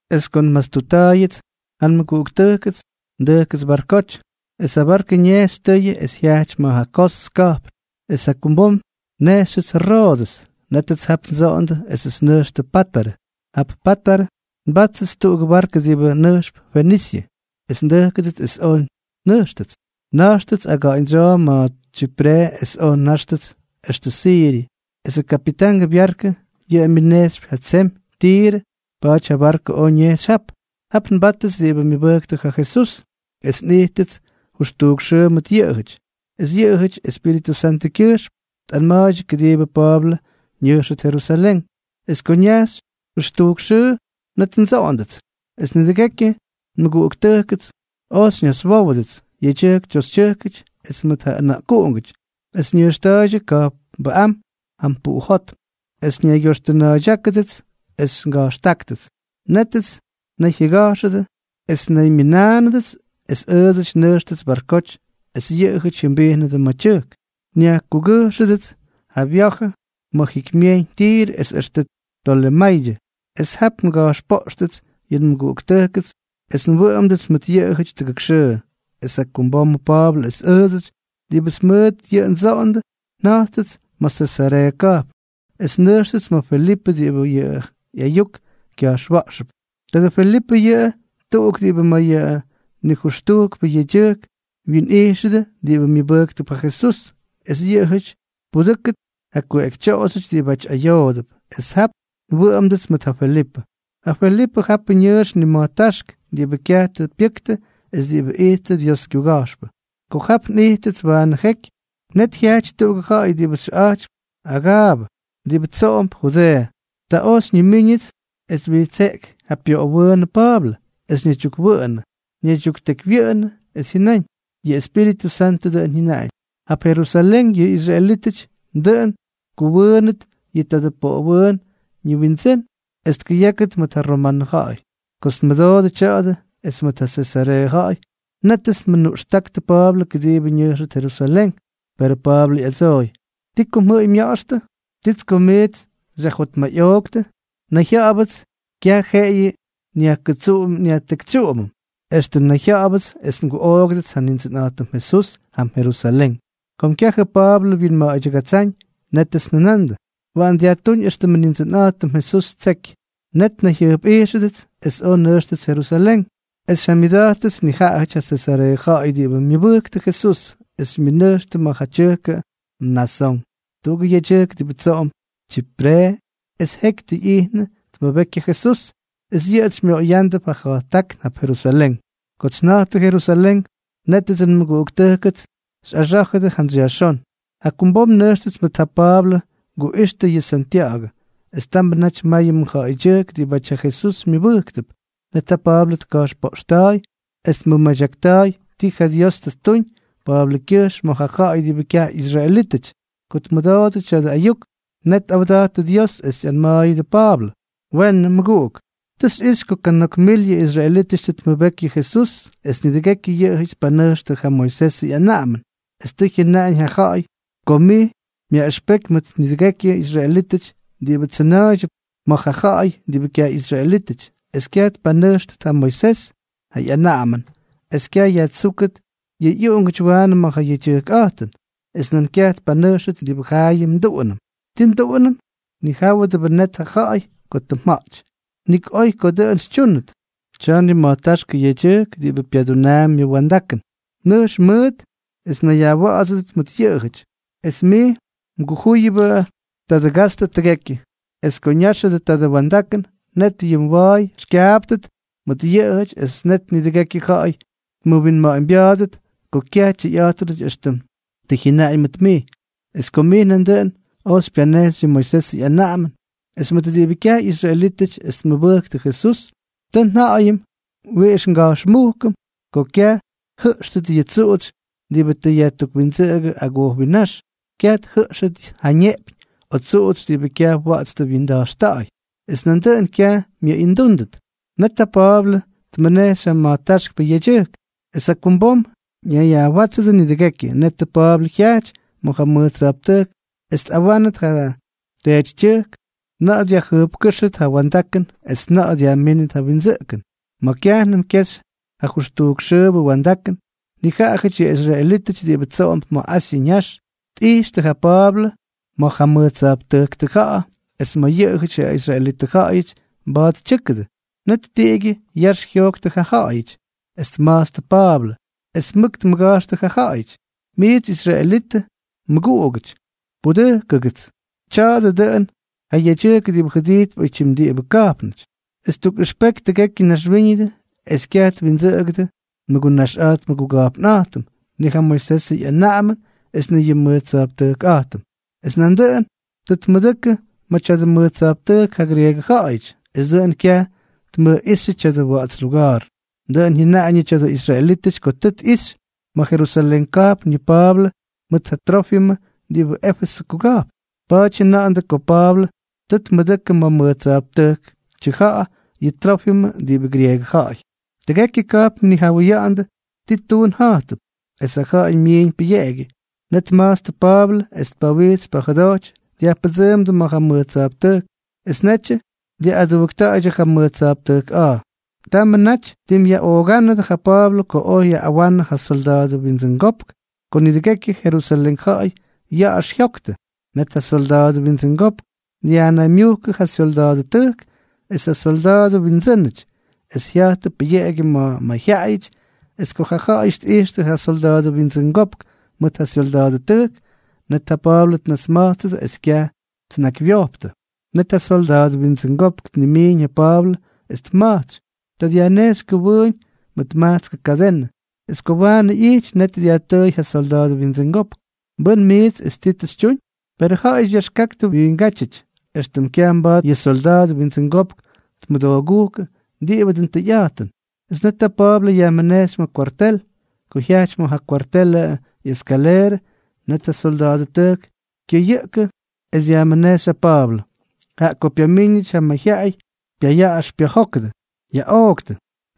Es ko nmastutta̱a̱yʉts ja nmʉguꞌuktʉjkʉts, ndʉjkʉts barkoty, es ja barkʉ ñejxy tʉyʉ es jyaꞌty ma̱ ja Kos ka̱jpn, es jakumbom nnejxyʉts Roodʉs. Nétʉts jap ndsoꞌondʉ esʉts nnʉjxtʉ Pátarʉ. Jap Pátarʉ mbáttʉts tuꞌugʉ barkʉ diꞌibʉ nʉjxp Fenisyʉ, es ndʉjkʉdʉts es oj nnʉjxtʉts. Na̱jxtʉts aga̱ꞌa̱ñdsyoo ma̱ Tsyipre es oj nnʉjxtʉts extʉ Siryʉ. Esʉ kapitangʉ byarkʉ, yʉꞌʉ myʉnejxypy ja tsemy Tirʉ, pa̱a̱ty ja barkʉ oj ñejxy jap. Jap nbáttʉts diꞌibʉ myʉbʉjktʉ ja Jesús, es nꞌijttʉts jʉxtujk xʉʉ mʉt yʉꞌʉjʉty, es yʉꞌʉjʉty Espíritʉ Santʉkyʉjxm tꞌanma̱a̱ydyʉ kʉdiibʉ Pa̱a̱blʉ ñʉjxʉt Jerusalén. Es ko ñajxy jʉxtujk xʉʉ, net ndsoꞌondʉts. Es nidʉgekyʉ nmʉguꞌuktʉjkʉts oj xyñaswówʉdʉts, yedyʉjk toxytyʉjkʉty es mʉt ja ʉna̱ꞌkuꞌungʉty, es ñʉjxta̱a̱ydyʉ ka̱jpnbʉꞌám jam puꞌujótm, es nnaygyoxtʉna̱a̱ydyákʉdʉts es nga̱jxtáktʉts. Nétʉts nnayjyʉga̱jxʉdʉ es nnaymyʉnánʉdʉts es ʉʉdsʉty nnʉjxtʉts barkoty, es yʉꞌʉjʉty jyʉmbijnʉdʉ ma̱ tyʉjk. Nyajkugʉjxʉdʉts ja nvya̱jʉ ma̱ jikymyejyñ Tirʉ es extʉ Tolemaydyʉ. Es jap nga̱jxpoꞌxtʉts yʉ nmʉguꞌuktʉjkʉts es nwʉꞌʉmdʉts mʉt yʉꞌʉjʉty tuk xʉʉ. Es jakumbomʉ Pa̱a̱blʉ es ʉʉdsʉty diꞌibʉts mʉt yʉꞌʉ ndsoꞌondʉ, nja̱jttʉts ma̱ Sesareeʉ ka̱jpn. Es nnʉjxtʉts ma̱ Felipʉ diꞌibʉ Jesús ja ꞌyayuk kya̱jxwa̱ꞌxʉp. Tadʉ Felipʉ yʉꞌʉ tuꞌuk diꞌibʉ ma̱ yʉ nijʉxtujkpʉ yedyʉjk winꞌijxʉdʉ diꞌibʉ myʉbʉjktʉp ja Jesús, es yʉꞌʉjʉty tpudʉ́kʉt ja kuꞌekytyoꞌoxyʉty diꞌibʉty ayoodʉp. Es jap nwʉꞌʉmdʉts mʉt ja Felipʉ. Ja Felipʉ japʉ ñʉʉx nima̱jtáxk diꞌibʉ kyaj tʉ pyʉktʉ es diꞌibʉ ijttʉ Diosʉ kyuga̱jxpʉ. Ko jap nꞌijttʉts waanʉ jeky, net jyajty tuꞌugʉ ja̱ꞌa̱y diꞌibʉ xyʉꞌa̱jtypy Agaabʉ, diꞌibʉ tsoꞌomp Judeeʉ. Ta oj xyñimíñʉts es twijtseꞌky ja pyoꞌowʉʉnʉ Pa̱a̱blʉ, es ñaydyukkʉwʉꞌʉn ñaydyuktekywyʉꞌʉnʉ, es jyʉnáñ: —Yʉ Espíritʉ Santʉ dʉꞌʉn jyʉnaꞌañ: “Jap Jerusalén yʉ israelítʉty dʉꞌʉn tkʉwʉʉnʉt yʉ tadʉ poꞌowʉʉnʉ ñiwindsʉ́n es tkʉyákʉt mʉt ja romanʉ ja̱ꞌa̱y.” Kots nmʉdoodʉ tya̱a̱dʉ es mʉt ja Sesareeʉ ja̱ꞌa̱y, nétʉts nmʉnuꞌxtáktʉ Pa̱a̱blʉ kʉdiibʉ ñʉjxʉt Jerusalén. Perʉ Pa̱a̱blʉ ꞌyadsooy: —¿Ti ko mjʉꞌʉy mya̱ꞌa̱xtʉ? ¿Tits ko miits xyajjotmayꞌooktʉ? Nayjya̱ꞌa̱bʉts kyaj jeꞌeyʉ nyajkʉtsúm nyajtekytsyúmʉt, extʉ nayjya̱ꞌa̱bʉts es nguꞌoogʉdʉts ja Nindsʉnꞌa̱jtʉm Jesús jam Jerusalén. Kom kyajʉ Pa̱a̱blʉ wyinma̱a̱ydyʉgatsáñ, nétʉts njʉnandʉ: —Waꞌan yajtúñ éxtʉmʉ Nindsʉnꞌa̱jtʉm Jesús ttseky. Net nnayjyʉjpꞌijxʉdʉts es oj nnʉjxtʉts Jerusalén. Es xyjamyʉda̱jttʉts nijaꞌajʉty ja Sesareeʉ ja̱ꞌa̱y diꞌibʉ myʉbʉjktʉ Jesús, es xymyʉnʉjxtʉ ma̱ ja tyʉjkʉ Mnasón, tuꞌugʉ yedyʉjk diꞌibʉ tsoꞌomp Tsyipre es jeky tʉ ꞌyijnʉ tmʉbeky ja Jesús, es yʉꞌʉts xymyoꞌoyándʉp ja ja̱jttákn jap Jerusalén. Kots nja̱jttʉ Jerusalén, nétʉdsʉ nmʉguꞌuktʉjkʉts xyꞌaxá̱jʉdʉ jantsy yajxón. Jakumbom nnʉjxtʉts mʉt ja Pa̱a̱blʉ nguꞌixtʉ yʉ Santya̱ꞌa̱gʉ, es tamʉ naty mayʉ mʉjja̱ꞌa̱ydyʉjk diꞌibáty ja Jesús myʉbʉjktʉp. Net ja Pa̱a̱blʉ tka̱jxpoꞌxta̱a̱y, es tmʉmadyakta̱a̱y ti ja Dios tʉ ttuñ Pa̱a̱blʉkyʉjxm ma̱ ja̱ꞌa̱y diꞌibʉ kyaj ꞌyisraelítʉty. Ko tmʉdoodʉ tya̱dʉ ayuk, net tꞌawda̱jttʉ Dios es ꞌyanma̱a̱yʉdʉ Pa̱a̱blʉ: —Weenʉ, mʉguꞌuk. Tʉ xyꞌixy ko kana̱k mil yʉ israelítʉty tʉ tmʉbeky yʉ Jesús es nidʉgekyʉ yʉꞌʉjʉty tpanʉjxtʉ ja Moisesʉ ꞌyanaꞌamʉn, es tʉ jyʉnaꞌañ ja ja̱ꞌa̱y ko mij myaꞌʉxpeky mʉt nidʉgekyʉ israelítʉty diꞌibʉ tsʉna̱a̱ydyʉp ma̱ ja ja̱ꞌa̱y diꞌibʉ kyaj ꞌyisraelítʉty, es kyaj tpanʉjxʉt ja Moisesʉ ꞌyanaꞌamʉn es kyaj yajtsúkʉt yʉ ꞌyuꞌungʉty waanʉ ma̱ ja yedyʉjkꞌa̱jtʉn, es nan kyaj tpanʉjxʉt diꞌibʉ jaayʉm nduꞌunʉm. ¿Ti nduꞌunʉm? Ñijáwʉdʉbʉ net yʉ ja̱ꞌa̱y ko tʉ mja̱ꞌty. Nik oy ko dʉꞌʉn xytyúnʉt. Tya̱a̱ nima̱jtáxkʉ yedyʉjk diꞌibʉ pyadunaampy yʉ wa̱ndakʉn. Nʉjx mʉʉt es mnayyajwa̱ꞌa̱dsʉdʉt mʉt yʉꞌʉjʉty, es mij mgujúyʉbʉ tadʉ gastʉ tʉgekyʉ. Es ko ñáxʉdʉ tadʉ wa̱ndakʉn, net yʉ mwa̱a̱y xykyaaptʉt mʉt yʉꞌʉjʉty es net nidʉgekyʉ ja̱ꞌa̱y tmʉwinma̱ꞌa̱ñbya̱a̱dʉt ko kyaj tyʉyꞌa̱jtʉnʉty éxtʉm tʉ jyʉnaꞌañ mʉt mij, es ko mij nandʉꞌʉn oy xypyanejxy yʉ Moisesʉ ꞌyanaꞌamʉn. Es mʉt diꞌibʉ kyaj ꞌyisraelítʉty es tmʉbʉktʉ Jesús, tʉ nja̱ꞌa̱yʉm wiꞌix nga̱jxmujkʉm ko kyaj tjʉꞌxtʉt yʉ tsuꞌutsy diꞌibʉ tʉ yajtukwindsʉꞌʉgʉ agojwinnáx, kyaj tjʉꞌxtʉt ja neꞌpyñ o tsuꞌutsy diꞌibʉ kyaj wa̱ꞌa̱ts tʉ wyinda̱jxta̱ꞌa̱y, es nandʉꞌʉn kyaj myʉꞌindúndʉt. Net ja Pa̱a̱blʉ tmʉnejxy ja ma̱jtáxkpʉ yedyʉjk, es jakumbom ñayyajwátsʉdʉ nidʉgekyʉ. Netʉ Pa̱a̱blʉ jyajty ma̱ ja mʉj tsa̱jptʉjk es tꞌawánʉt ja teetytyʉjk na̱ꞌa̱ dyajjʉjpkʉ́xʉt ja wa̱ndakʉn es na̱ꞌa̱ dyajmínʉt ja windsʉꞌkʉn. Ma̱ kyajnʉm kyexy ja jʉxtujk xʉʉbʉ wa̱ndakʉn, nijaꞌajʉty yʉ israelítʉty diꞌibʉ tsoꞌomp ma̱ Asyʉ ñax, tꞌijxtʉ ja Pa̱a̱blʉ ma̱ ja mʉj tsa̱jptʉjk tʉja̱ꞌa̱ es ma̱ yʉꞌʉyʉty ja israelitʉ ja̱ꞌa̱yʉty mba̱a̱t tyʉ́kʉdʉ. Net niꞌigʉ yax jyojktʉ ja ja̱ꞌa̱yʉty, es tma̱jtstʉ Pa̱a̱blʉ, es mʉk tmʉga̱jxtʉ ja ja̱ꞌa̱yʉty: —¡Miits israelitʉ mʉguꞌugʉty, pudʉjkʉgʉts! Tya̱a̱dʉ dʉꞌʉn ja yedyʉjk diꞌibʉ jʉdijtp oytyim diꞌibʉ ka̱jpnʉty, es ttukꞌʉxpeky tʉgekyʉ naxwíñʉdʉ es kyaj twindsʉꞌʉgʉdʉ nmʉgunaxꞌa̱jt nmʉguga̱jpnꞌa̱jtʉm, ni ja Moisesʉ ꞌyanaꞌamʉn es ni yʉ nmʉj tsa̱jptʉjkꞌa̱jtʉm. Es nandʉꞌʉn tʉ tmʉdʉkʉ ma̱ tya̱dʉ mʉj tsa̱jptʉjk ja grieegʉ ja̱ꞌa̱yʉty, es dʉꞌʉn kyaj tmʉjꞌíxyʉ tya̱dʉ wa̱ꞌa̱ts luga̱a̱r. Dʉꞌʉn jyʉnaꞌañʉ tya̱dʉ israelítʉty ko tʉ tꞌixy ma̱ Jerusalén ka̱jpn yʉ Pa̱a̱blʉ mʉt ja Trófimʉ diꞌibʉ Éfesʉ kuga̱jpn. Pa̱a̱ty jyʉnandʉ ko Pa̱a̱blʉ tʉ tmʉdʉkʉ ma̱ mʉj tsa̱jptʉjk tʉja̱ꞌa̱ yʉ Trófimʉ diꞌibʉ grieegʉ ja̱ꞌa̱y. Tʉgekyʉ ka̱jpn tnijawʉyandʉ ti tuun ja̱jtʉp, es ja ja̱ꞌa̱y myiiñ pʉyeꞌegyʉ. Net tma̱jtstʉ Pa̱a̱blʉ es pawitsy pajʉdoty dyajpʉdsʉʉmdʉ ma̱ ja mʉj tsa̱jptʉjk, es netyʉ dyaꞌꞌadujkta̱a̱ydyʉ ja mʉj tsa̱jptʉjkꞌa̱a̱. Tamʉ naty tim yaꞌoogánʉdʉ ja Pa̱a̱blʉ ko oj yaꞌꞌawanʉ ja solda̱a̱dʉ windsʉngopk ko nidʉgekyʉ Jerusalén ja̱ꞌa̱y ya̱ꞌa̱x jyoktʉ. Net ja solda̱a̱dʉ windsʉngopk dyajnaymyujkʉ ja syolda̱a̱dʉtʉjk es ja solda̱a̱dʉ windsʉ́nʉty, es jya̱jttʉ pʉyeꞌegyʉ ma̱ mayjyaꞌayʉty. Es ko ja ja̱ꞌa̱yʉty tꞌijxtʉ ja solda̱a̱dʉ windsʉngopk mʉt ja syolda̱a̱dʉtʉjk, net ja Pa̱a̱blʉ tnasma̱jtsʉdʉ es kyaj tnakywyojptʉ. Net ja solda̱a̱dʉ windsʉngopk tnimiiñ ja Pa̱a̱blʉ es tma̱jtsy. Ta dyajnejxy kʉwʉʉñ mʉt majtskʉ kadenʉ. Es ko waanʉ ꞌyijty, net dyajtʉʉy ja solda̱a̱dʉ windsʉngopk: —¿Mbʉ́n mijts, es ti tʉ xytyuñ? Perʉ ja̱ꞌa̱yʉty yaxkaktʉ wiingátyʉty éxtʉm kyaj mba̱a̱t yʉ solda̱a̱dʉ windsʉngopk tmʉdoogúkʉ diꞌibʉ dʉn tʉyꞌa̱jtʉn. Es net ja Pa̱a̱blʉ yajmʉnejxy ma̱ kwartel. Ko jyajty ma̱ ja kwartelʉ ꞌyeskaleerʉ, net ja solda̱a̱dʉtʉjk kyʉyʉꞌkʉ es yajmʉnejxy ja Pa̱a̱blʉ, jaꞌa ko pyamíñʉty ja mayjyaꞌay pyayaꞌaxy pyajékyʉty: —¡Yaꞌooktʉ!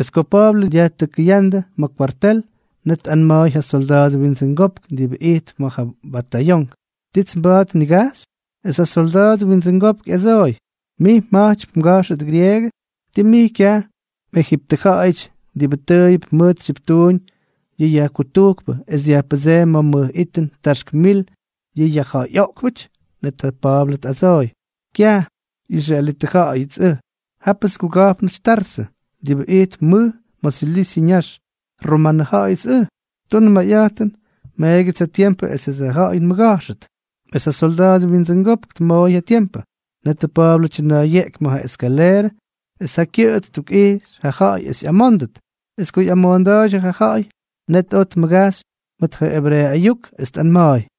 Es ko Pa̱a̱blʉ dyajtʉkʉyándʉ ma̱ kwartel, net tꞌanma̱a̱y ja solda̱a̱dʉ windsʉngopk diꞌibʉ ijtp ma̱ ja batayonk: —¿Tits mba̱a̱t nnigajxy? Es ja solda̱a̱dʉ windsʉngopk ꞌyadsooy: —¿Mij mja̱jtypy mga̱jxʉt grieegʉ? ¿Tii mij kyaj mꞌejiptʉja̱ꞌa̱yʉty diꞌibʉ tʉʉyʉp mʉt tsyiptuuñ yʉ yajkutujkpʉ es dyajpʉdseemy ma̱ mʉj ittum taxk mil yʉ yajja̱ꞌa̱yꞌoꞌkpʉty? Net ja Pa̱a̱blʉ ꞌyadsooy: —¡Kyaj! Israelitʉ ja̱ꞌa̱yʉts ʉj, jápʉts nguga̱jpnʉty Tarsʉ, diꞌibʉ ijtp mʉj ma̱ Silisyʉ ñax, romanʉ ja̱ꞌa̱yʉts ʉj. Tunʉ mayꞌa̱jtʉn, meegyʉts ja tiempʉ esʉts ja ja̱ꞌa̱y nmʉga̱jxʉt. Es ja solda̱a̱dʉ windsʉngopk tmooy ja tiempʉ. Netʉ Pa̱a̱blʉ tyʉna̱a̱yeꞌky ma̱ ja eskaleerʉ es ja kyʉꞌʉ ttukꞌijxy ja ja̱ꞌa̱y es ꞌyamóndʉt. Es ko ꞌyamoonda̱a̱ydyʉ ja ja̱ꞌa̱y, net oj tmʉgajxy mʉt ja ebreeʉ ayuk, es tꞌanma̱a̱y: